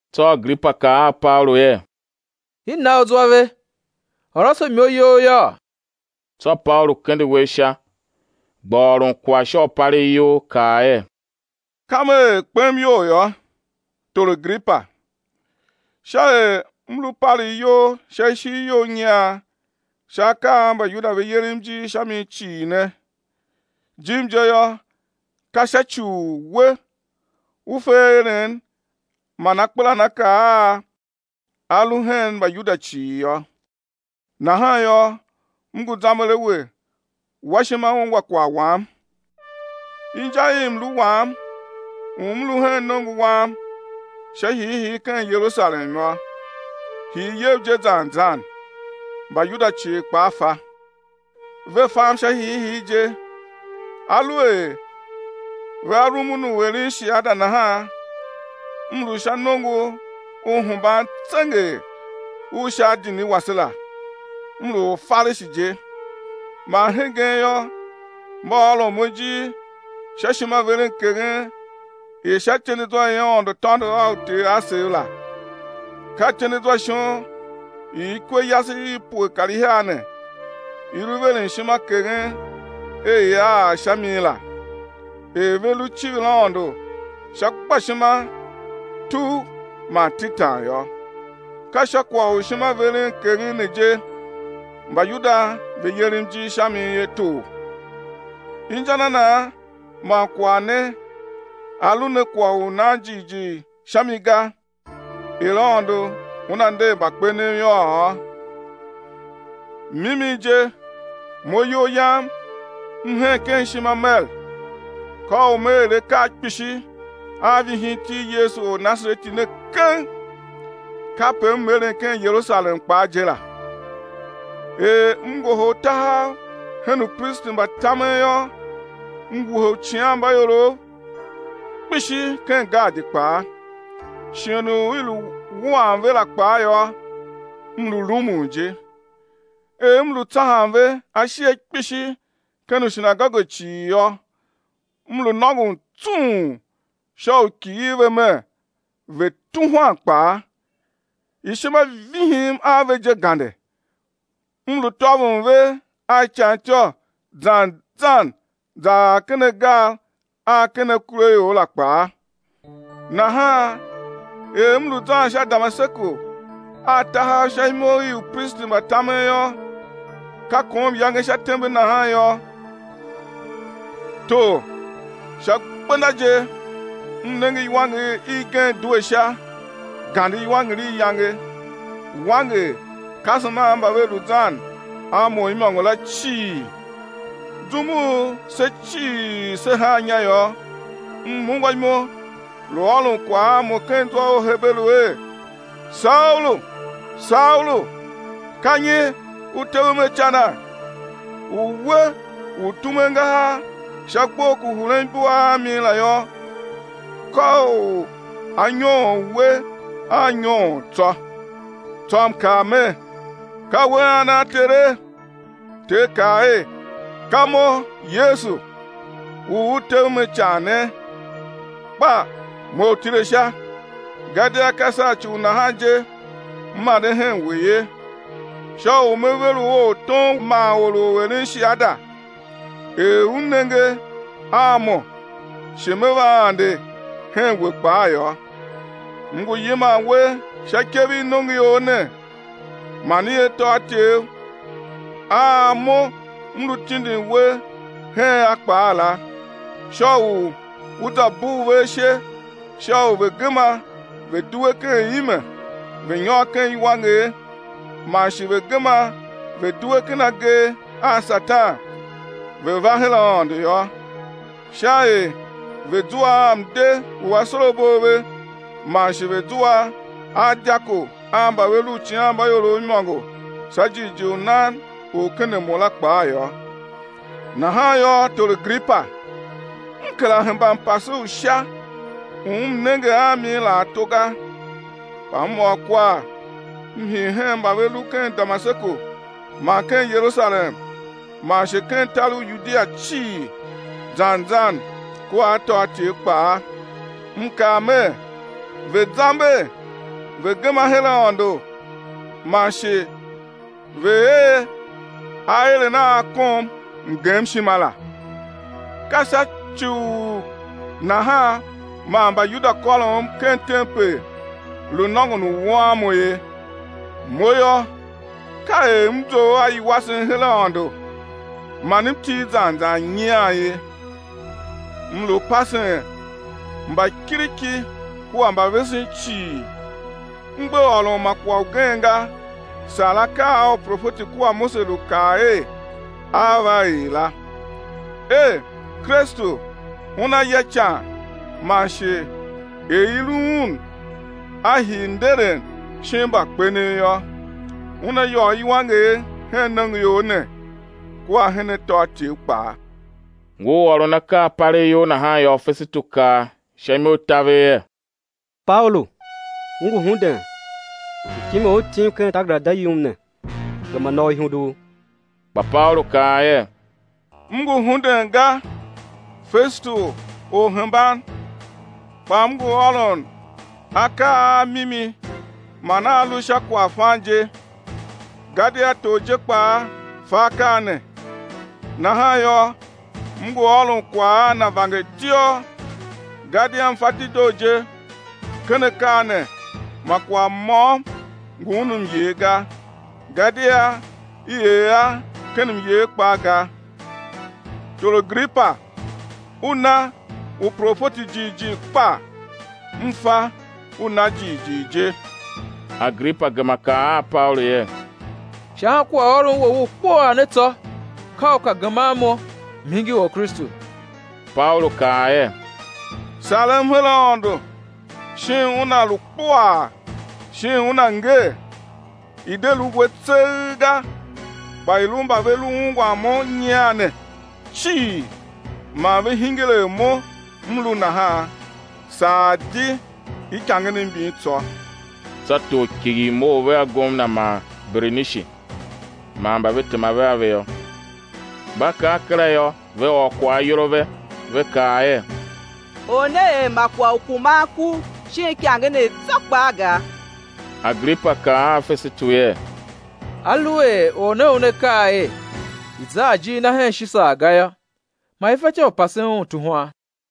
Tsô Agripa kaa a Paulu er: I na u zwa ve, ôr ase imo you yôô. Tsô Paulu kende uwegh sha, gba ôron kwagh sha u palegh iyol, kaa er: Kam er kpem iyol yô, tor Agripa, sha er m lu palegh iyol sha ishigh you nyian sha akaa a Mbayuda ve yerem ijir sha mi cii ne, jim je yô, ka sha ci u we u fe aeren man akpelanakaa a a lu hen Mbayuda cii yô; nahan yô, m ngu zamber a we, wa ishima ungwa kwagh wam. Inja i mlu wam u m lu hen nongo wam sha hiihii ken Yerusalem yô, hii iyev je zan zan, Mbayuda cii kpaa fa. Ve fam sha hiihii je; aluer vea rumun u eren shiada nahan, m lu sha nongo u hemban tsenger u sha adini wase la, m lu Orfarishi je. Man hegen yô, mba ôron mo ijir sha ishimaverenkeghen i sha ityendezwa i Aôndo tôndo a uter asev la, ka ityendezwa shon i ikwe yase i pue kar ihiar ne i lu veren ishima keghen er ia ar sha mi la, er ve lu civir Aôndo sha gbashima tugh man tetan yô. Ka sha kwagh u ishimaverenkeghen ne je, Mbayuda ve yerem ijir sha mi ye, tor. Inja na nan man kwagh ne a lu ne kwagh u nan jighjigh sha mi ga, er Aôndo Una nder mbakpenev yôô? Mimi je, mo iyol yam m hen ken ishima mer: ka u me er akaa kpishi a vihin iti i Yesu Ornasareti ne keng. Kape m eren ken Yerusalem kpaa je la; er m ngohol tahav hen upristi mba tamen yô, m wuhe uicighanmbaiorov kpishi ken gaadi kpaa; shighe u i lu wuan ve la kpaa yô, m lu rumun je. Er m lu tsahan ve ashighe kpishi ken ushinagoge cii yô, m lu nôngon tsung sha u kighir ve mer, ve̱ tuhwan kpaa; ishima vihim a ve je gande, m lu tôvon ve a ican ityô zan zan ar ken agar a ken akuraior la kpaa. Nahan er m lu zan sha Damaseku a tahav sha imo i upristi mba tamen yô, ka kom iyange sha tembe nahan yô, tor, sha gbenda je, m nenge iwanger igen due Sha, gande iwanger i iyange, wanger kasem a mba ve lu zan a mo imôngo la cii. Zum u se cii se haa inya yô, m ungwa imo, lu ôron kwagh a mo ken zwa u Heberu er: Saulu, Saulu, ka nyi u tevem a icana? U we u tume angahar sha gbough ku huren ibua a mi la yô, ka u á nyoon we a nyoon tsô. Tsô m kaa mer: Ka we ana Tere, Ter kaa er: Ka Mo, Yesu, u u tevem a ican ne. Kpa mough tile sha, gadia ka sha ci u nahan je M ande hen we ye, sha u Me ver u ortom man or u eren shiada er u nenge a Mo shi Me va ande hen we kpaa yô. M ngu yiman we sha ikev i nongoior ne man i atôatyev a Mo M lu tindin we hen a kpaa la, sha u ú za bugh ve ashe sha u ve̱ gema ve̱ due ken ime, ve̱ nyôr ken iwanger man shi ve̱ gema ve̱ due ken agee a Satan, ve̱ va her Aôndo yô, sha er ve̱ zua a mde u asorabo a ve man shi ve̱ zua a dyako a mba ve lu uicighanmbaiorov imôngo sha jighjigh u nan u ken a Mo la kpaa yô. Nahan yô, tor Agripa, m kera hemba mpase u Sha, u m nenge a mi la ato ga. Kpa m ôr kwagh m hii hen mba ve lu ken Damaseku man ken Yerusalem man shi ken tar u Yudia cii zan zan kua atôatyev kpaa, m kaa mer, ve̱ zamber, ve̱ gema her Aôndo, man shi ve̱ er aeren a a kom mgemshima la. Ka sha ci u nahan man Mbayuda kôrom ken tempel, lu nôngon u wuan mo ye. Mo yô, ka er m zough a iwasen her Aôndo man m til zan zan nyian ye; m lu pasen mbakiriki kua mbavesen cii, m gbe ôron ma kwagh ugen ga saa akaa a uprofeti kua Mose lu kaa er á va er la, er, Kristu Una ya ican man shi er i lu Un A hii nderen shin mbakpenev yô, Una yôô iwanger hen nongoior ne kua hen atôatyev kpaa. Ngur ôron akaa palegh iyol nahan yô, Fesetu kaa sha imo i taver er: Paulu, u ngu hunden! Mtime u u tim ken takerada yum ne, gema na u ihundugh. Kpa Paulu kaa er: M ngu hunden ga, Fesetu orhemban, kpa m ngu ôron akaa a mimi man a a lu sha kwaghfan je. Gadia tor je kpaa fa akaa ne, nahan yô, m ngu ôron kwagh a na vangertiôr, gadia m fa dedoo je, ken akaa ne ma kwagh môm ngu un myer ga, gadia i er a ken myer kpaa ga. Tor Agripa, u na uprofeti jighjigh kpa? M fa, u na jighjigh je. Agripa gema kaa a Paulu er: Sha ankwaghôron wou u kpuaa ne tsô, ka u ka geman mo, m̱ hingir Orkristu! Paulu kaa er: Sarem her Aôndo shin una lu kpuaa shin una ngee, i̱ de lu we tseegh ga, kpa i̱ lu mba ve lu ungwan mo nyian ne cii ma ve hingir er mo m lu nahan, saa di ikangenev mbin tsô. Tsô tor kighir mough vea gomna man Berenishi man mba ve tema a ve yô. Mba kar kera yô, ve ôr kwagh ayol a ve, ve kaa er: Or ne er ma kwagh u kuman ku shin ikangenev tsô kpaa ga. Agripa kaa a Fesetu er: Aluer or ne una kaa er, i̱ za a ijir na hen Shisar ga yô, ma i fatyô u pasen un tuhwan.